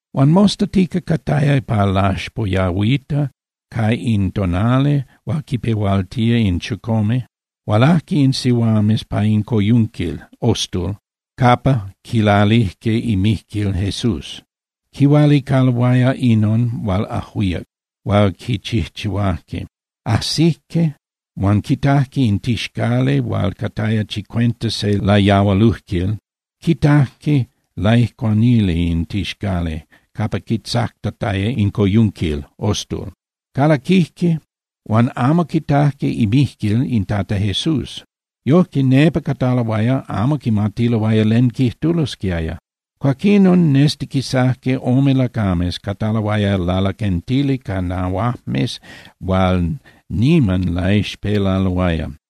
Huan mostatica, cataya pa laxpoyahuita pa in tonali hual quipehualtía in chicome, hualajque in sihuames pa in coyunquil (ostul) capa quilalijque imijquil Jesús. Quihualicaloaya inon hual ajuíac hual quichijchihuajque. Ajsijque, huan quitajque in tixcali hual cataya chicuenta se layahualujquil, quitajque laijcuanili in tixcali capa quitzactataya in coyunquil (ostul). Calaquijque, huan amo quitajque imijquil in Tata Jesús. Yojque, nepa cataloaya, amo quimatiloaya len quijtulosquiaya. Cuaquinon nestiquisajque ome lacames, cataloaya lalaquentili ca nahuajmes hual niman laixpelaloaya.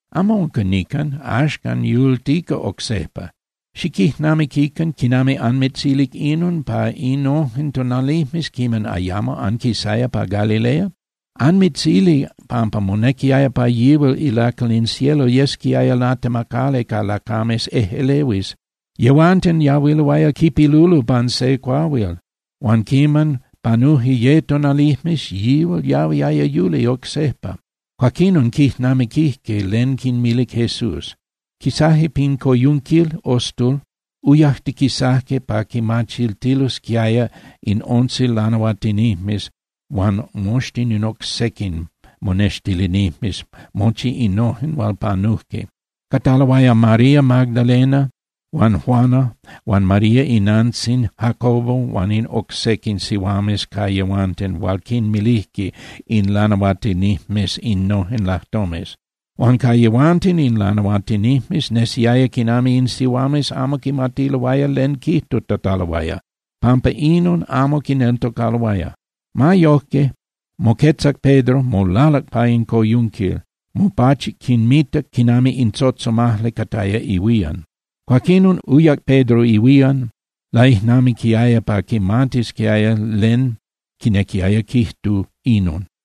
Amo unca nican, axcan yultica oc sejpa. Xiquijnamiquican quinami anmitzilic inon pa innojen tonalijmes quiman ayamo anquisaya pa Galilea. Anmitzilic pampa monequiaya pa yihual ilacal in cielo yesquiaya latemacali ca lacames ejꞌelehuis. Yehuanten yahuiloaya quipilulo pan se cuahuil, huan quiman panuje ye tonalijmes, yihual yahuiaya yuli oc sejpa. Cuaquinon quijnamiquijque len quinmilic Jesús. Quisaje pin coyunquil (ostul), uyajtiquisajque pa quimachiltilosquiaya in once lanahuatinijmes huan moxtin in oc sequin monextilinijmes mochi innojen hual panujque. Cataloaya María Magdalena, huan Juana huan María inantzin Jacobo huan in oc sequin sihuames ca yehuanten hual quinmilijque in lanahuatinijmes innojen lajtomes. Huan ca yehuanten in lanahuatinijmes nesiaya quinami in sihuames amo quimatiloaya len quijtutataloaya, pampa inon amo quineltocaloaya. Ma yoje, moquetzac Pedro, molaluc pa in coyunquil, mopachuc quinmitac quinami in tzotzomajli cataya ihuían. Cuaquinon uyac Pedro ihuían, laijnamiquiaya pa quimatisquiaya len quinequiaya quijtu inon.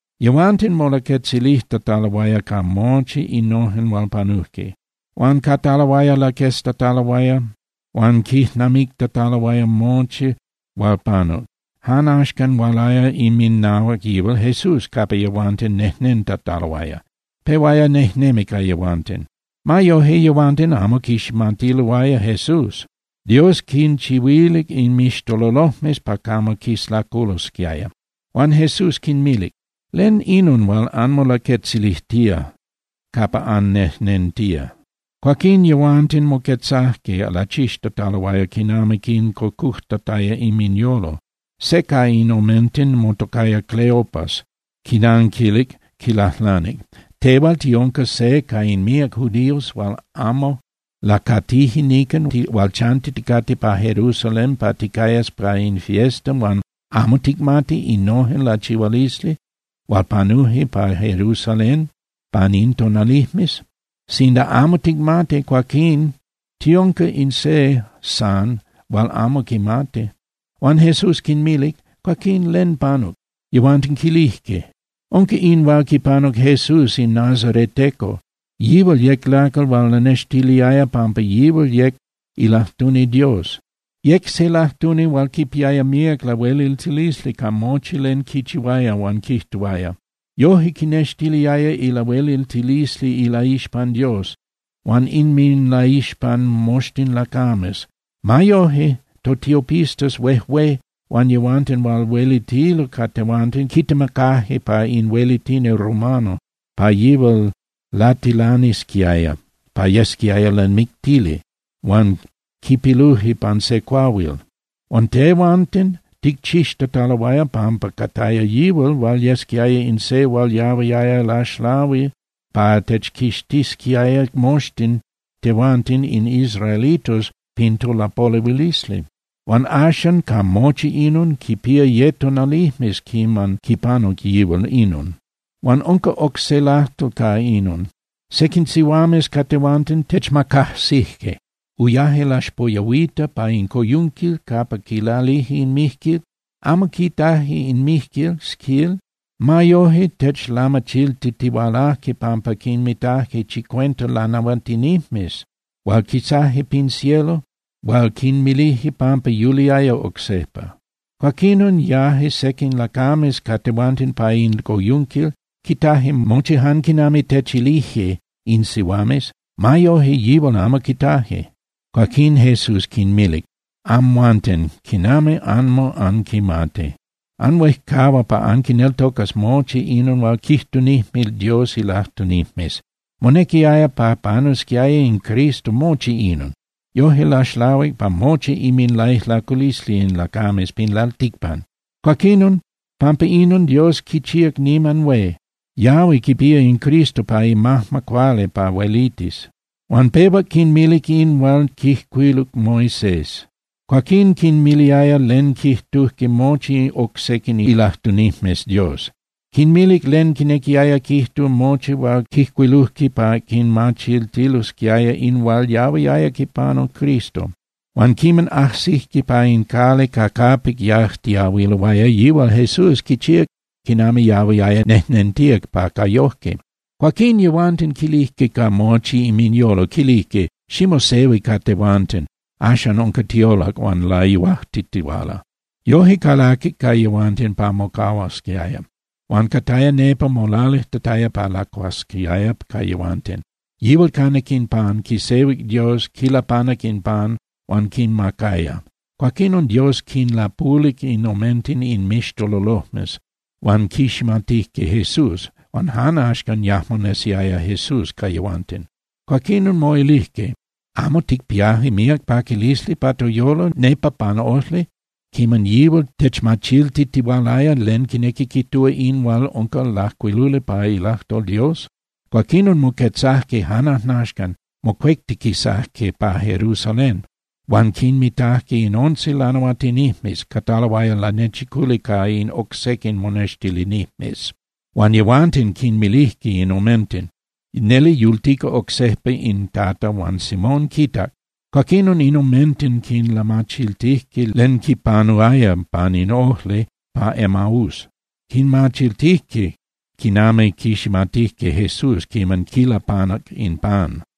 Yehuanten molaquetzilijtataloaya ca mochi innojen hual panujque. Huan cataloaya laqueztataloaya huan quijnamictataloaya mochi hual panuc, jan axcan hualaya inminahuac yihual Jesús capa yehuanten nejnentataloaya, pehuaya nejnemi ca yehuanten. Ma yoje, yehuanten amo quiximatiloaya Jesús, Dios quinchihuilic inmixtololojmes pa camo quislaculosquiaya. Huan Jesús quinmilic: —¿Len inon hual anmolaquetzilijtía capa annejnentía? Cuaquín yehuanten moquetzajque, lachixtataloaya quinami quincocujtataya inminyolo. Se ca in omenten motocaya Cleopas quinanquilic, quilajlanic: —¿Tehual tiunca se ca in míac judíos hual amo lacatije nican hual chantiticate pa Jerusalén pa ticayas pa in fiesta huan amo ticmati innojen lachihualisli hual panuje pa Jerusalén pan in tonalijmes? Sinda amo ticmati, cuaquín tiunca in se san hual amo quimati. Huan Jesús quinmilic: —Cuaquín, ¿len panuc? Yehuanten quilijque: —Unca in hual quipanuc Jesús in nazareteco. Yihual yec lacal hual lanextiliaya pampa yihual yec ilajtuni Dios. Yec se lajtuni hual quipiaya míac lahueliltilisli ca mochi len quichihuaya huan quijtuaya. Yoje quinextiliaya ilahueliltilisli ilaixpan Dios huan inminlaixpan moxtin lacames. Ma yoje, totiopistas huejué huan yehuanten hual huelitilo ca tehuanten quitemacaje pa in huelitini romano pa yihual latilanisquiaya pa yesquiaya lamictili, huan quipiluje pan se cuahuil. Huan tehuanten ticchixtataloaya pampa cataya yihual hual yesquiaya in se hual yahuiaya laxlahui pa techquixtisquiaya moxtin tehuanten in israelitos pin topolehuilisli. Huan axan, ca mochi inon, quipía ye tonalijmes quiman quipanuc yihual inon. Huan unca oc se lajtol ca inon. Sequin sihuames ca tehuanten techmacajsije. Uyaje laxpoyahuita pa in coyunquil capa quilalije in mijquil. Amo quitaje in mijquil, quil. Ma yoje, techlamachiltitihualaje pampa quinmitaje chicuenta lanahuatinijmes hual quisaje pin cielo hual quinmilije pampa yuliaya oc sejpa. Cuaquinon yaje sequin lacames ca tehuanten pa in coyunquil, quitaje mochi jan quinami techilije in sihuames. Ma yoje, yihual amo quitaje. Cuaquín Jesús quinmilic: —Amhuanten, ¡quinami amo anquimati! Anhuejcahua pa anquineltocas mochi inon hual quijtunijme Dios ilajtunijmes. Monequiaya pa panusquiaya in Cristo mochi inon, yoje laxlahuic pa mochi inminlaijlaculisli in lacames pin lalticpan. Cuaquinon pampa inon Dios quichíac niman hué, yahui quipía in Cristo pa imajma cuali pa huelitis. Huan pehuac quinmilic in hual quijcuiluc Moisés. Cuaquín quinmiliaya len quijtujque mochi oc sequin ilajtunijmes Dios. Quinmilic len quinequiaya quijtu mochi hual quijcuilujque pa quinmachiltilosquiaya in hual yahuiaya quipanu Cristo. Huan quiman ajsijque pa in cali ca capic yajtiahuiloaya, yihual Jesús quichíac quinami yahuiaya nejnentía pa ca yojque. Cuaquín yehuanten quilijque ca mochi inminyolo, quilijque: —Ximosehui ca tehuanten, axan unca tiolac huan layuajtitihuala. Yoje calaquic ca yehuanten pa mocahuasquiaya. Huan cataya nepa molalijtataya pa lacuasquiaya ca yehuanten, yihual canac in pan, quisehuic Dios, quilapanac in pan huan quinmacaya. Cuaquinon Dios quinlapulic in omenten inmixtololojmes huan quiximatijque Jesús. Huan jan axcan yajmo nesiaya Jesús ca yehuanten. Cuaquinon moilijque: —¿Amo ticpiaje míac paquilisli pa toyolo nepa pan ojli quiman yihual techmachiltitihualaya len quinequi quijtúa in hual unca lajcuiluli pa ilajtol Dios? Cuaquinon moquetzajque jan ajnaxcan, mocuectiquisaje pa Jerusalén huan quinmitajque in once lanahuatinijmes, cataloaya lanechiculi ca in oc sequin monextilinijmes. Huan yehuanten quinmilijque in omenten: —Neli yultica oc sejpa in Tata huan Simón quitac. Cuaquinon in omenten quinlamachiltijque len quinpanuaya pan in ojli pa Emaús, quinmachiltijque quinami quiximatijque Jesús quiman quilapanac in pan.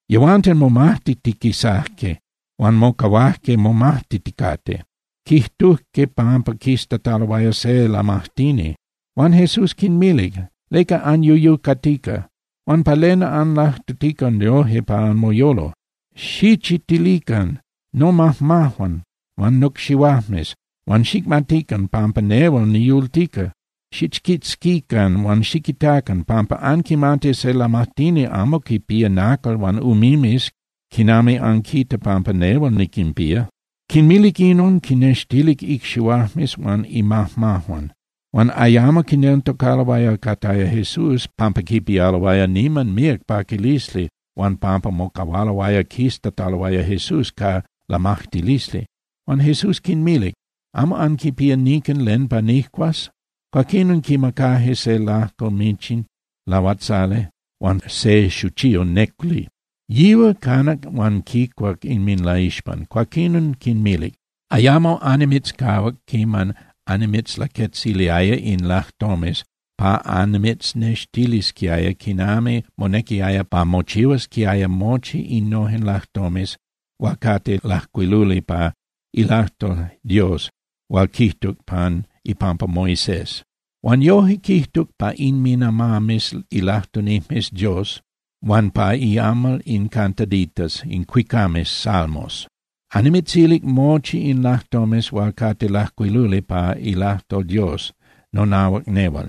Yehuanten momajtitiquisajque huan mocahuajque momajtiticate, quijtujque pampa quiztataloaya se lamajtini. Huan Jesús quinmilic: —¿Leca anyuyucatica? Huan ¿pa len anlajtutica yoje pa anmoyolo? Xichitilican nomajmajuan huan nocxihuajmes, huan xicmatican pampa nehual niyultica. Xichquitzquican huan xiquitacan, pampa anquimati se lamajtini amo quinpía nacal huan umimes quinami anquita pampa nehual niquinpía. Quinmilic inon, quinnextilic icxihuajmes huan imajmajuan. Huan ayamo quineltocaloaya cataya Jesús pampa quipialoaya niman míac paquilisli huan pampa mocahualoaya quiztataloaya Jesús ca lamajtilisli. Huan Jesús quinmilic: —¿Amo anquipía nican len pa nijcuas? Cuaquinon quimacajque se lajco michin lahuatzali huan se xuchiyo néculi. Yihual canac huan quicuac inminlaixpan. Cuaquinon quinmilic: —Ayamo annimitzcahuac quiman annimitzlaquetziliaya in lajtomes pa annimitznextilisquiaya quinami monequiaya pa mochihuasquiaya mochi innojen lajtomes hual cate lajcuiluli pa ilajtol Dios hual quijtuc pan ipampa Moisés. Huan yoje quijtuc pa inminamames ilajtunijmes Dios huan pa iamal in cantaditas (cuicames) Salmos. Annimitzilic mochi in lajtomes hual cate lajcuiluli pa ilajtol Dios nonahuac nehual.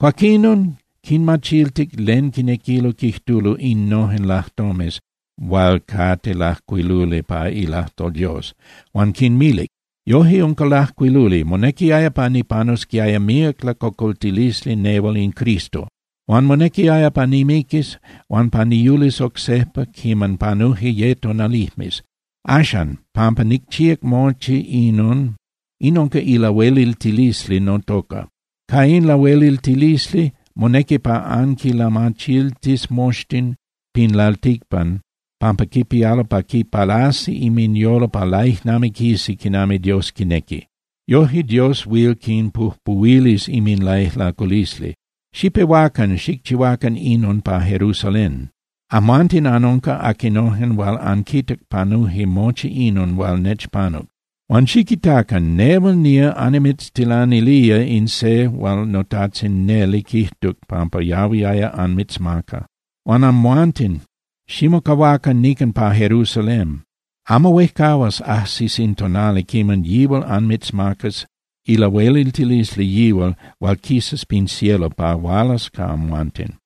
Cuaquinon quinmachiltic len quinequilo quijtulo innojen lajtomes hual cate lajcuiluli pa ilajtol Dios. Huan quinmilic: —Yoje unca lajcuiluli. Monequiaya pa nipanusquiaya míac lacocoltilisli nehual in Cristo, huan monequiaya pa nimiquis huan pa niyulis oc sejpa quiman panuje ye tonalijmes. Axan, pampa nicchíac mochi inon, in unca ilahueliltilisli notoca. Ca in lahueliltilisli, monequi pa anquinlamachiltis moxtin pin lalticpan pampa quipialo pa quipalasi inminyolo pa laijnamiquisi quinami Dios quinequi. Yoje Dios huil quinpujpuhuilis inminlaijlaculisli. Xipehuacan xicchihuacan inon pa Jerusalén. Amhuanten anunca aquinojen hual anquitac panuje mochi inon hual nechpanuc. Huan xiquitacan. Nehual nía annimitztilanilía in se hual noTajtzin neli quijtuc pampa yahuiaya anmitzmaca. Huan amhuanten, ximocahuacan nican pa Jerusalén. Amo huejcahuas ajsis in tonali quiman yihual anmitzmacas ilahueliltilisli yihual hual quisas pin cielo pa hualas ca amhuanten.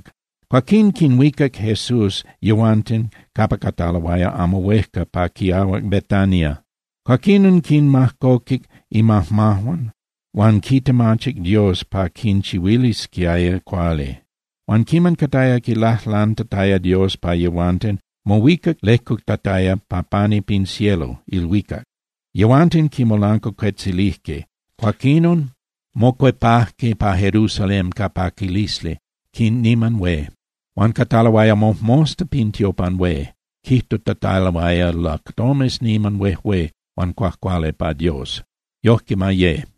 Cuaquín quinhuicac Jesús yehuanten capa cataloaya amo huejca pa quiahuac Betania. Cuaquinon quinmajcoquic imajmajuan huan quitemachic Dios pa quinchihuilisquiaya cuali. Huan quiman cataya quilajlantataya Dios pa yehuanten, mohuicac lejcutataya pa pani pin cielo (ilhuicac). Yehuanten quimolancuacuetzilijque, cuaquinon mocuepajque pa Jerusalén ca paquilisli niman hué. Huan cataloaya mojmosta pin tiopan hué, quijtutataloaya lajtomes niman huejué huan cuajcuali pa Dios. Yojque ma ye.